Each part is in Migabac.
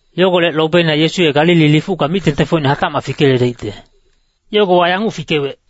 Yogolec lobeina Yesu ye Galili lifucka mic-tengtengfocine hatacmac fikeyeledaicte. Yogowa yanguc fikewec,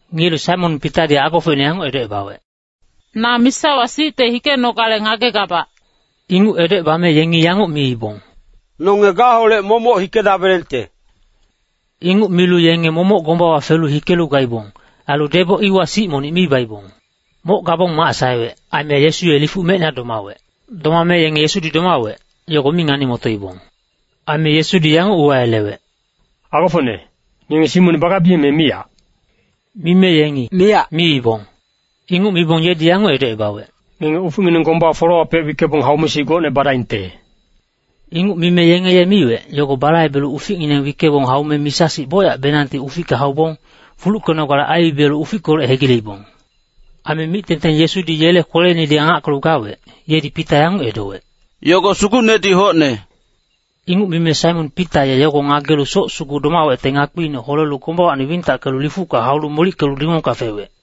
Ngiyelu Saimon Pitadi agofocine yanguc edocebawec, “Na misawa sicte hikenogale ngagegabac.” Inguc edocebame yengi yanguc miibong, “Nonge gaholec momoc hikedabelengte.” Inguc milu yenge momoc gombawa felu hikelu gaibong. Ailu deboc iwa sic monic mi baibong. Moc gabong mac saewec, aime Yesu ye lifuc mecina domawec. Domame yenge Yesudi domawec, yogo mi ngani-motoibong. Aime Yesudi yanguc uwayelewec, “Agofocne, ngenge sic monic bagabiyeng, me miyac?” Mime yengi “miyac” miibong. Inguc mibong yedi yanguc edocebawec, “Ngenge uficngineng gomba folewapec wickebong haume sic gocne badaingte.” Inguc mime yenge ye miwec, yogo balaibelu uficngineng wickebong haume misa-sic bocyacbenangti uficka haubong, fuluckenogale aibibiyelu ufickolec hegileibong. Aime mic-tengteng Yesudi yele kweleinedi angackelu gawec, yedi Pita yanguc edowec, “Yogo Sugucnedi hocne.” Inguc mime Saimon Pita ye yogo ngagelu soc sugu domawecte ngakpiine holelu gombawacni wintackelu lifucka haulu molickelu dingongka fewec.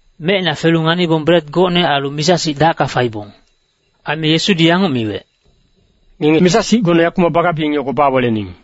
Mecina felu nganibong bret gocne ailu misa-sic dacka faibong. Aime Yesudi yanguc miwec, “Ngenge misa-sic gocne yakumac bagabiyeng, yogo bawelening.”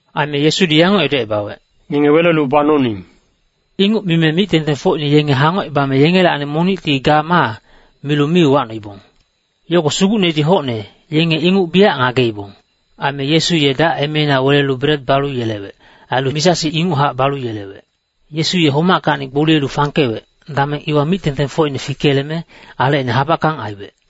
Aime Yesudi yanguc edocebawec, “Ngenge welelu banoning.” Inguc mime mic-tengtengfocine yenge hangocebame yengelacni monicti “Ga ma” milu mi uwacnoibong. Yogo Sugucnedi hocne, yenge inguc biyac ngageibong. Aime Yesu ye dac emeina welelu bret balu yelewec. Ailu misa-sic inguchac balu yelewec. Yesu ye homackacni gboliyelu fangkewec, dameng iwa mic-tengtengfocine fikeyeleme, alecine habackang aiwec.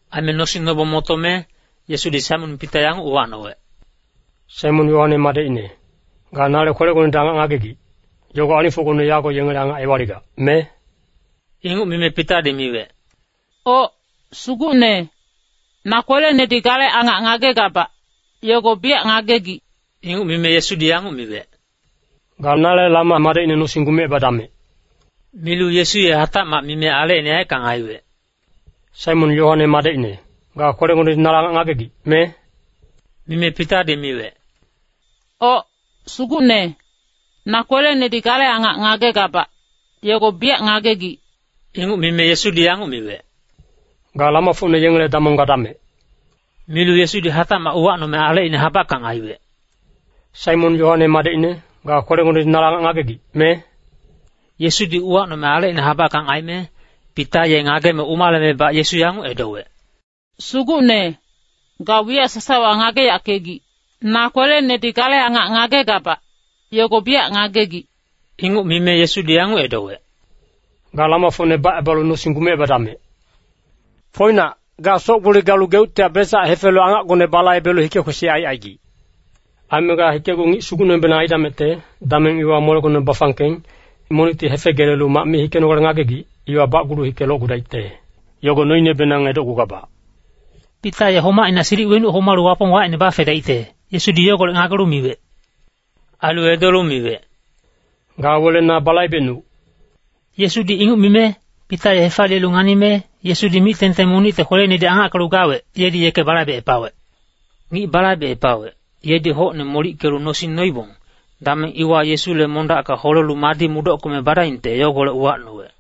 Aime nosing nobong motome, Yesudi Saimon Pita yanguc uwacnowec, “Saimon Yoane madecine, ga nale kwelegonedi angac ngagegic, yogo alingfocgone yago yengele angac ewaligac, me?” Inguc mime Pitadi miwec, “Oc, Sugucne, na kwelenedi gale angac ngagegabac, yogo biyac ngagegic.” Inguc mime Yesudi yanguc miwec, “Ga nale lama madecne nosing gumecebadamec.” Milu Yesu ye hatacmac mime alecine yaeckang aiwec, “Saimon, Yoane madecine, ga kwelegonedi nale angac ngagegic, me?” Mime Pitadi miwec, “Oc, Sugucne, na kwelenedi gale angac ngagegabac, yogo biyac ngagegic.” Inguc mime Yesudi yanguc miwec, “Ga lamafocne yengele damong gadamec.” Milu Yesudi hatacmac uwacnome alecine habackang aiwec, “Saimon, Yoane madecine, ga kwelegonedi nale angac ngagegic, me?” Yesudi uwacnome alecine habackang aime, Pita ye ngageme umalemebac Yesu yanguc edowec, “Sugucne, ga wiyac sasawa ngageyackegic. Na kwelenedi gale angac ngagegabac, yogo biyac ngagegic.” Inguc mime Yesudi yanguc edowec, “Ga lamafocne bacebalu nosing gumecebadamec. Foinac, ga soc-gboli galu geuctihac besac hefelu angacgone balaibelu hike-kwesic aicaigic. Aime ga hikecgu ngic sugucnebenang aidamecte, dameng iwa molegone bafangkeng, monicti hefegelelu mac mi hikenogale ngagegic, iwa bacgulu hike locgudaicte, yogo noinebenang edocgugabac.” Pita ye homacina silic wenuc homalu Wapong wacine bafedaicte, Yesudi yogolec ngagelu miwec. Ailu edolu miwec, “Ga wele na balaibecnuc.” Yesudi inguc mime, Pita ye hefaliyelu nganime, Yesudi mic-tengteng monicte kweleinedi angackelu gawec, yedi yeke balaibecepawec. Ngic balaibecepawec, yedi hocne molickelu nosing noibong, dameng iwa Yesule mondacka holelu madi mudockeme badaingte yogolec uwacnowec.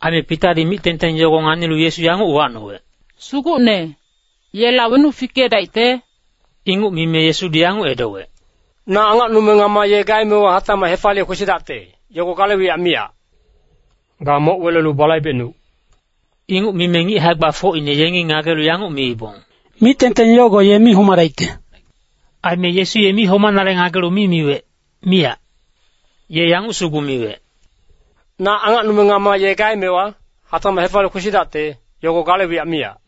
Aime Pitadi mic-tengteng yogo nganilu Yesu yanguc uwacnowec, “Sugucne, yela wenuc fikedaicte?” Inguc mime Yesudi yanguc edowec, “Na angacnume ngama ye gaemewa hatacmac hefaliye kwesidacte, yogo gale wiyac miyac. Ga moc welelu balaibecnuc.” Inguc mime ngic hae-gbafocine yengi ngagelu yanguc miibong, “Mic-tengteng yogo ye mi homadaicte.” Aime Yesu ye mi homanale ngagelu mi miwec, miyac. Ye yanguc sugu miwec, “Na angacnume ngama ye gaemewa, hatacmac hefaliye kwesidacte, yogo gale wiyac miyac.”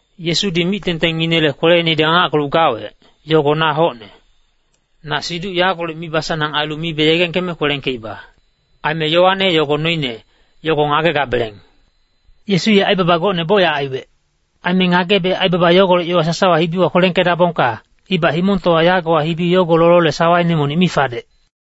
Yesudi mic-tengtenginele kweleinedi angackelu gawec, yogo na hocne. Na siduc yagolec mibasanang ailu mibe yegengkeme kwelengkeiba. Aime yowane yogo noine, yogo ngagegabeleng. Yesu ye aibaba gocne bocyac aiwec. Aime ngagebe aibaba yogolec yowa sasawa hibiwa kwelengkedabongka, ibac himongtowa yagowa hibi yogo lolole sawaine monic mi fadec.